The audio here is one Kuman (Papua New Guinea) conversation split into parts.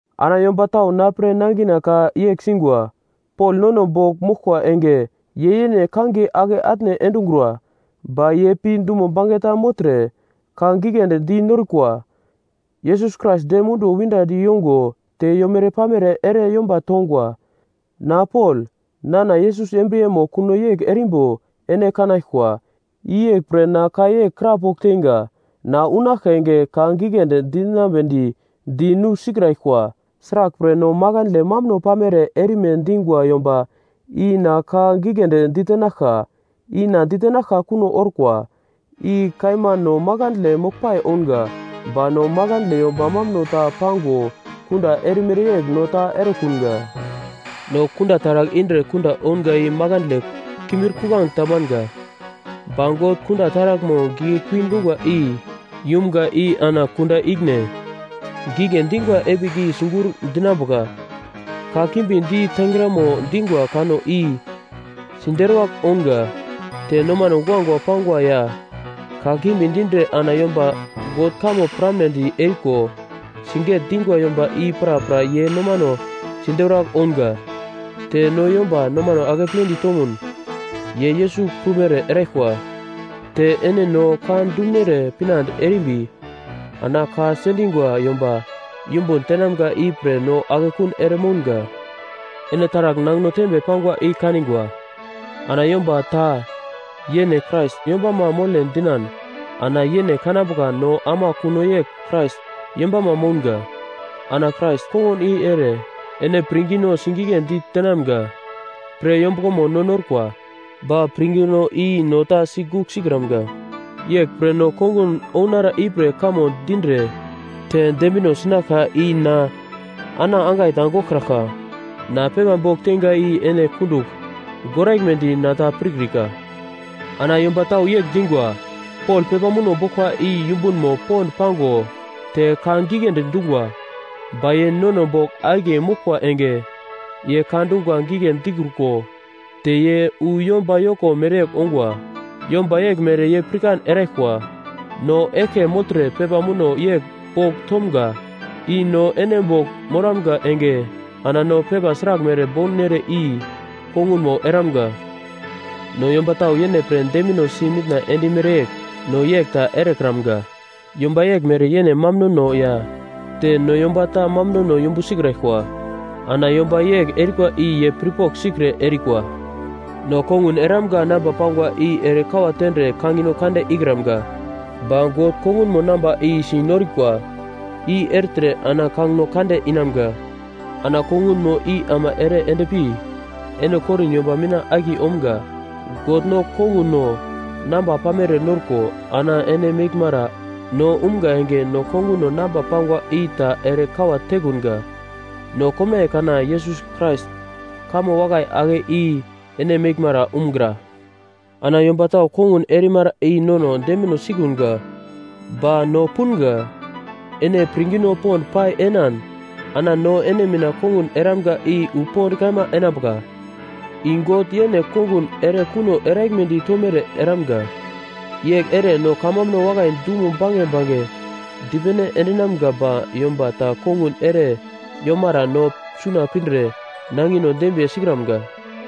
Ana yomba tau na pre nangina ka yegl singwa, “Pol nono bogl moglkwa enge ye yene kangiye ake atne endungura, ba ye pi dumo bange ta mogltre ka giglendi di norukwa.” Yesus Krais dem munduwo windadi yongo te yomere-pamere ere yomba tongwa. Na Pol nana Yesus embriyemo kuno yegl erimbo ene kanaglkwa. I yegl pre na ka yegl krapogl teinga, na unaglka enge ka giglendi dinambedi di nusikraglkwa. Sraglpre, no makandle mambuno pamere erime dingwa yomba i na ka giglendi ditenaglka, i na ditenaglka kuno orkwa. I kaima no makandle moglpai ounga, ba no makandle yomba mambuno ta pango kunda erimere yegl no ta erekunga. No kunda taragl indre kunda ounga i makandle kimbir-kuglange ta manga. Ba God kunda taraglmo giglekui dungwa i yumga i ana kunda ikine gigle dingwa epigl i sigur dinambuka. Kakimbi di tengramo dingwa kanno i siderwagl ounga. Te nomano guagua pangwa ya kakimbi dindre ana yomba God kamo piramnedi eriko siget-dingwa yomba i prapra ye nomano siderwagl ounga. Te no yomba nomano akepledi tomun ye Yesus prumere eraglkwa. Te ene no ka dumunere pinande erimbi ana ka sendingwa yomba yumbun tenamga i pre no akekun ere mounga. Ene taragl nangino tembe pangwa i kaningwa. Ana yomba ta yene Krais yombamo mole dinan ana yene kanambuka no ama kuno yegl Krais yombama mounga. Ana Krais kongun i ere ene pirngino sigigledi tenamga pre yombuglomo no norkwa, ba pirngino i no ta sigugl sikramga. Yeglpre no kongun ounara ipre kamo dindre te dembino sinaglka i na, ana angai ta goglkraglka. Na pepa bogl teinga i ene kundugl goraglmedi na ta pirkrika. Ana yomba tau yegl dingwa: “Pol pepa muno boglkwa i yumbunmo pond pago te ka giglendi dungwa. Ba ye nono bogl akiye moglkwa enge ye ka dungwa gigle dikruko te ye wu yomba yoko mere ongwa!” Yomba yeglmere ye pirkan eraglkwa, no eglke mogltre pepa muno yegl bogl tomga i no ene bogl moramga enge ana no pepa sraglmere bounere i kongunmo eramga. No yomba tau yene pre dembinosi mitna endimere yegl no yegl ta erekramga. Yomba yeglmere yene mambunono ya te no yomba ta mambunono yumbu sikraglkwa. Ana yomba yegl erikwa i ye pirpogl sikre erikwa. No kongun eramga namba pangwa i ere kawa tendre kangino kande ikramga. Ba God kongunmo namba si norikwa i ertre ana kangino kande inamga. Ana kongunmo i ama ere endpi ene Korin yomba mina akiye omga. God no konguno namba pamere norko ana ene meglmara no umga enge no konguno namba pangwa i ta ere kawa tekunga. No komnaiye kana Yesus Krais kamo wakai ake i ene meglmara umgra. Ana yomba tau kongun erimara i nono dembino sikunga. Ba no punga, ene pirngino pond pai enan ana no ene mina kongun eramga i wu pond kaima enambuka, i God yene kongun ere kuno eraglmedi tomere eramga. Yegl ere no kamambuno wakai dumo bange bange dipene endinamga ba yomba ta kongun ere yomara no suna pindre nangino dembiye sikramga.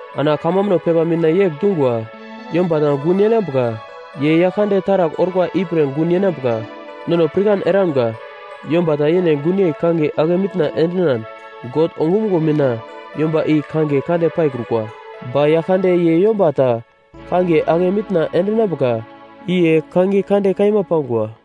Ana kamambuno pepa mina yegl dungwa, “Yomba ta gun yenambuka, ye Yaglkande taragl orkwa ipre gun enambuka.” Nono pirkan eramga, yomba ta yene gunyei kangiye ake mitna endinan, God ongumuglo mina yomba i kangiye kande paikrukwa. Ba Yaglkande ye yomba ta kangiye ake mitna endinambuka, i ye kangiye kande kaima pangwa.